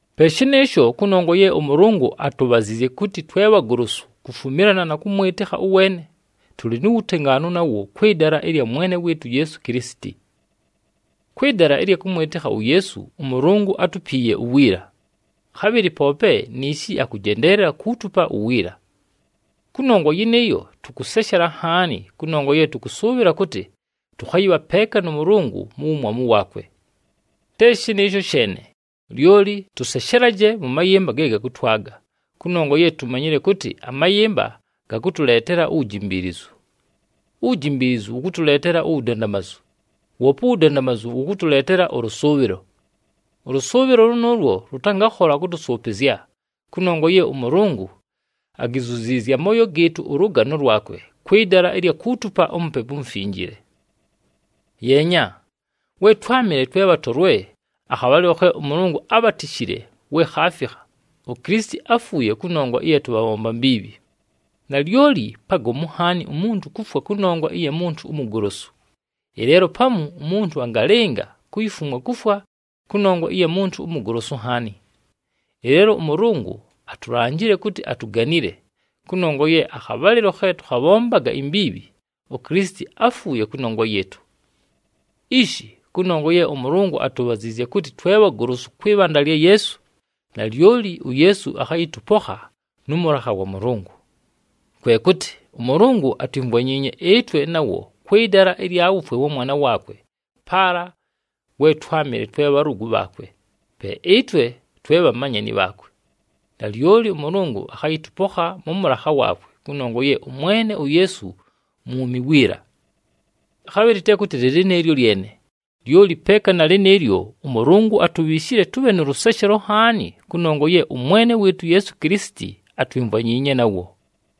Pe shɨnɨɨsho, kʉnongwa ye ʉMʉlʉngʉ atubhaziizye kʉtɨ twe bhagolosu kufumilana na kʉmwɨtɨkha ʉweene, tʉlɨ nu wutengaanu nawo kwɨ dala ɨlya Mwene wɨɨtʉ uYeesu Kilisiti. Kwɨ dala ɨlya kʉmwɨtɨkha uYeesu, ʉMʉlʉngʉ átupiiye uwiila, khabhɨlɨ poope niishi akʉjendeelela kuutupa uwiila. Kʉnongwa yɨnɨɨyo, tʉkʉseshela nhaani kʉnongwa ye tʉkʉsʉʉbhɨla kʉtɨ, tʉkhayɨbha peeka nʉ Mʉlʉngʉ mu wumwamu waakwe. Te shɨnɨɨsho sheene, lyoli tʉseshelaje mʉ mayɨmba ge gakʉtwaga, kʉnongwa ye tumanyile kʉtɨ amayɨmba gakʉtʉleetela uwujimbiilizu. Uwujimbiilizu wʉkʉtʉleetela uwudandamazu, woope uwudandamazu wʉkʉtʉleetela ʉlʉsʉʉbhɨlo. Ʉlʉsʉʉbhɨlo lʉnʉʉlwo lʉtangakhola kʉtʉsʉʉpɨzya, kʉnongwa ye ʉMʉlʉngʉ agizuziizye amooyo gɨɨtʉ ʉlʉgano lwakwe kwɨ dala ɨlya kuutupa uMupepu uMufinjile. Yeenya, we twámɨle twe bhatolwe, akhabhalɨlo khe ʉMʉlʉngʉ ábhatishile we khaafikha, uKilisiti áfuuye kʉnongwa ɨya tʉbhabhomba mbiibhi. Nalyoli pagomu nhaani umuntu kufwa kʉnongwa ɨya muntu umugolosu, ɨleelo pamu umuntu angalɨnga kuyifumwa kufwa kʉnongwa ɨya muntu umugolosu nhaani. Ɨleelo ʉMʉlʉngʉ atulanjile kʉtɨ atuganile, kʉnongwa ye akhabhalɨlo khe tʉkhabhombaga imbiibhi uKilisiti áfuuye kʉnongwa yɨɨtʉ. Ishi kʉnongwa ye ʉMʉlʉngʉ atubhaziizye kʉtɨ twe bhagolosu kwɨ bhanda lya Yeesu, nalyoli uYeesu akhayɨtʉpokha nʉ mʉlakha wa Mʉlʉngʉ. Kwe kʉtɨ ʉMʉlʉngʉ atwimvwanyiinye ɨtwe nawo kwɨ dala ɨlya wufwe wa Mwana waakwe paala we twámɨle twe bhalʉgʉ bhaakwe, pe ɨtwe twe bhamanyani bhaakwe. Nalyoli ʉMʉlʉngʉ akhayɨtʉpokha mʉ mʉlakha waakwe kʉnongwa ye ʉMwene uYeesu mwumi wiila. Khabhɨlɨ te kʉtɨ lɨ lɨnɨɨlyo lyene, lyoli peeka na lɨnɨɨlyo ʉMʉlʉngʉ atubhiishile tʉbhe nʉ lʉseshelo nhaani kʉnongwa ye ʉMwene wɨɨtʉ uYeesu Kilisiti atwimvwanyiinye nawo.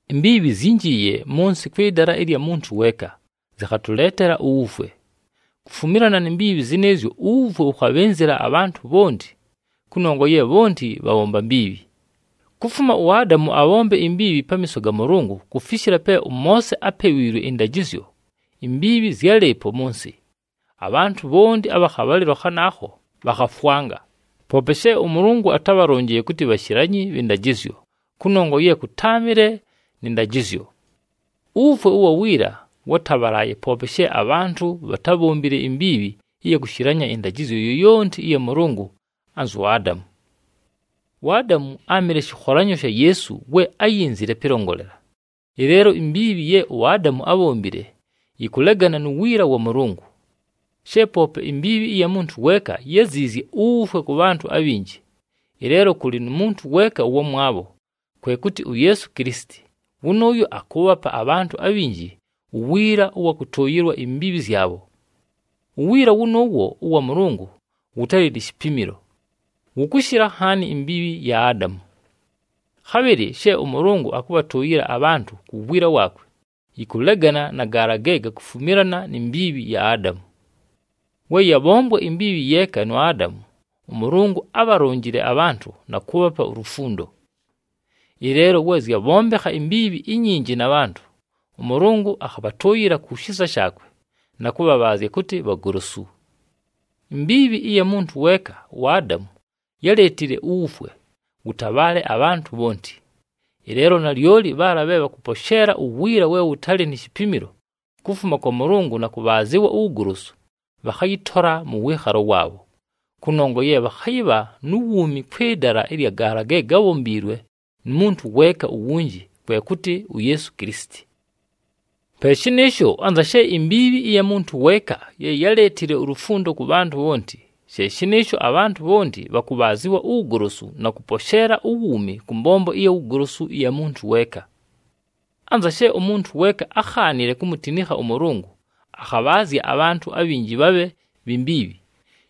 Imbiibhi zyínjiiye mʉ nsɨ kwɨ dala ɨlya muntu weeka, zɨkhatʉleetela uwufwe. Kufumilana ni mbiibhi zɨnɨɨzyo uwufwe wʉkhabhɨnzɨla abhantʉ bhonti, kʉnongwa ye bhonti bhabhombile mbiibhi. Kufuma uAdamu abhombe imbiibhi pamiiso ga Mʉlʉngʉ kufishila pe ʉMoose ápewiilwe ɨndajɨzyo, imbiibhi zyálɨɨpo mʉ nsɨ. Abhantʉ bhonti abha khabhalɨlo khanaakho bhakhafwanga, poope she ʉMʉlʉngʉ atábhalonjile kʉtɨ bhashilanyi bhɨ ndajɨzyo, kʉnongwa ye kʉtáamɨle nɨ ndajɨzyo. Uwufwe ʉwa wiila wátabhalaaye poope she abhantʉ bhatábhombile imbiibhi ɨya kushilanya ɨndajɨzyo yoyonti ɨya Mʉlʉngʉ anzu Adamu. UAdamu áamɨle shɨkholanyo sha Yeesu we áyinzile pɨlongolela. Ɨleelo, imbiibhi ye uAdamu ábhombile, yɨkʉlegana nu wiila wa Mʉlʉngʉ. She poope imbiibhi ɨya muntu weeka, yáziizye uwufwe kʉ bhantʉ abhinji. Ɨleelo kʉlɨ nu muntu weeka ʉwamwabho, kwe kʉtɨ uYeesu Kilisiti, wʉnʉʉyo akʉʉbhapa abhantʉ abhinji uwiila ʉwa kʉtʉʉyɨlwa imbiibhi zyabho. Uwiila wʉnʉʉwo ʉwa Mʉlʉngʉ wʉtalɨ ni shipimilo, wʉkʉshɨla nhaani imbiibhi ya Adamu. Khabhɨlɨ she ʉMʉlʉngʉ akʉbhatʉʉyɨla abhantʉ ku wiila waakwe, yɨkʉlegana na gaala ge gakufumilana ni mbiibhi ya Adamu. We yabhombwa imbiibhi yeeka nu Adamu, ʉMʉlʉngʉ ábhalonjile abhantʉ na kʉʉbhapa ulufundo. Ɨleelo we zyabhombekha imbiibhi inyinji na bhantʉ, ʉMʉlʉngʉ akhabhatʉʉyɨla ku shisa shaakwe, na kʉbhabhaazya kʉtɨ bhagolosu. Imbiibhi ɨya muntu weeka uAdamu yáleetile uwufwe wʉtabhaale abhantʉ bhonti. Ɨleelo nalyoli bhaala bhe bhakʉposheela uwiila we wʉtalɨ ni shipimilo kufuma kwa Mʉlʉngʉ na kʉbhaazɨwa uwugolosu, bhakhayɨtola mʉ wɨɨkhalo waabho, kʉnongwa ye bhakhayɨbha nu wuumi kwɨ dala ɨlya gaala ge gábhombiilwe nu muntu weeka uwunji, kwe kʉtɨ uYeesu Kilisiti. Pe shɨnɨɨsho, anza she imbiibhi ɨya muntu weeka ye yáleetile ulufundo kʉ bhantʉ bhonti, she shɨnɨɨsho abhantʉ bhonti bhakʉbhaazɨwa uwugolosu na kʉposheela uwuumi kʉ mbombo ɨya wugolosu ɨya muntu weeka. Anza she umuntu weeka ákhaanile kumutinikha ʉMʉlʉngʉ, akhabhaazya abhantʉ abhinji bhabhe bhi mbiibhi,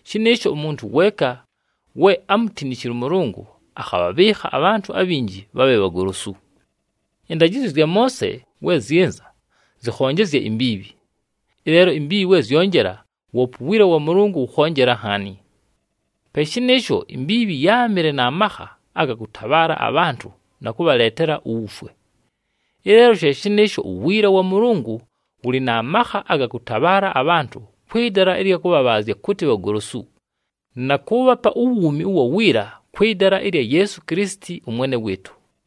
shɨnɨɨsho umuntu weeka we ámutinishile ʉMʉlʉngʉ, akhabhabhɨɨkha abhantʉ abhinji bhabhe bhagolosu. Ɨndajɨzyo zya Moose we zyɨnza zɨkhonjezya imbiibhi. Ɨleelo imbiibhi we zyonjela, woope uwiila wa Mʉlʉngʉ wʉkhonjela nhaani. Pe shɨnɨɨsho, imbiibhi yáamɨle na makha aga kʉtabhaala abhantʉ na kʉbhaleetela uwufwe. Ɨleelo she shɨnɨɨsho uwiila wa Mʉlʉngʉ wʉlɨ na makha aga kʉtabhaala abhantʉ kwɨ dala ɨlya kʉbhabhaazya kʉtɨ bhagolosu, na kʉʉbhapa uwuumi ʉwa wiila kwɨ dala ɨlya Yeesu Kilisiti ʉMwene wɨɨtʉ.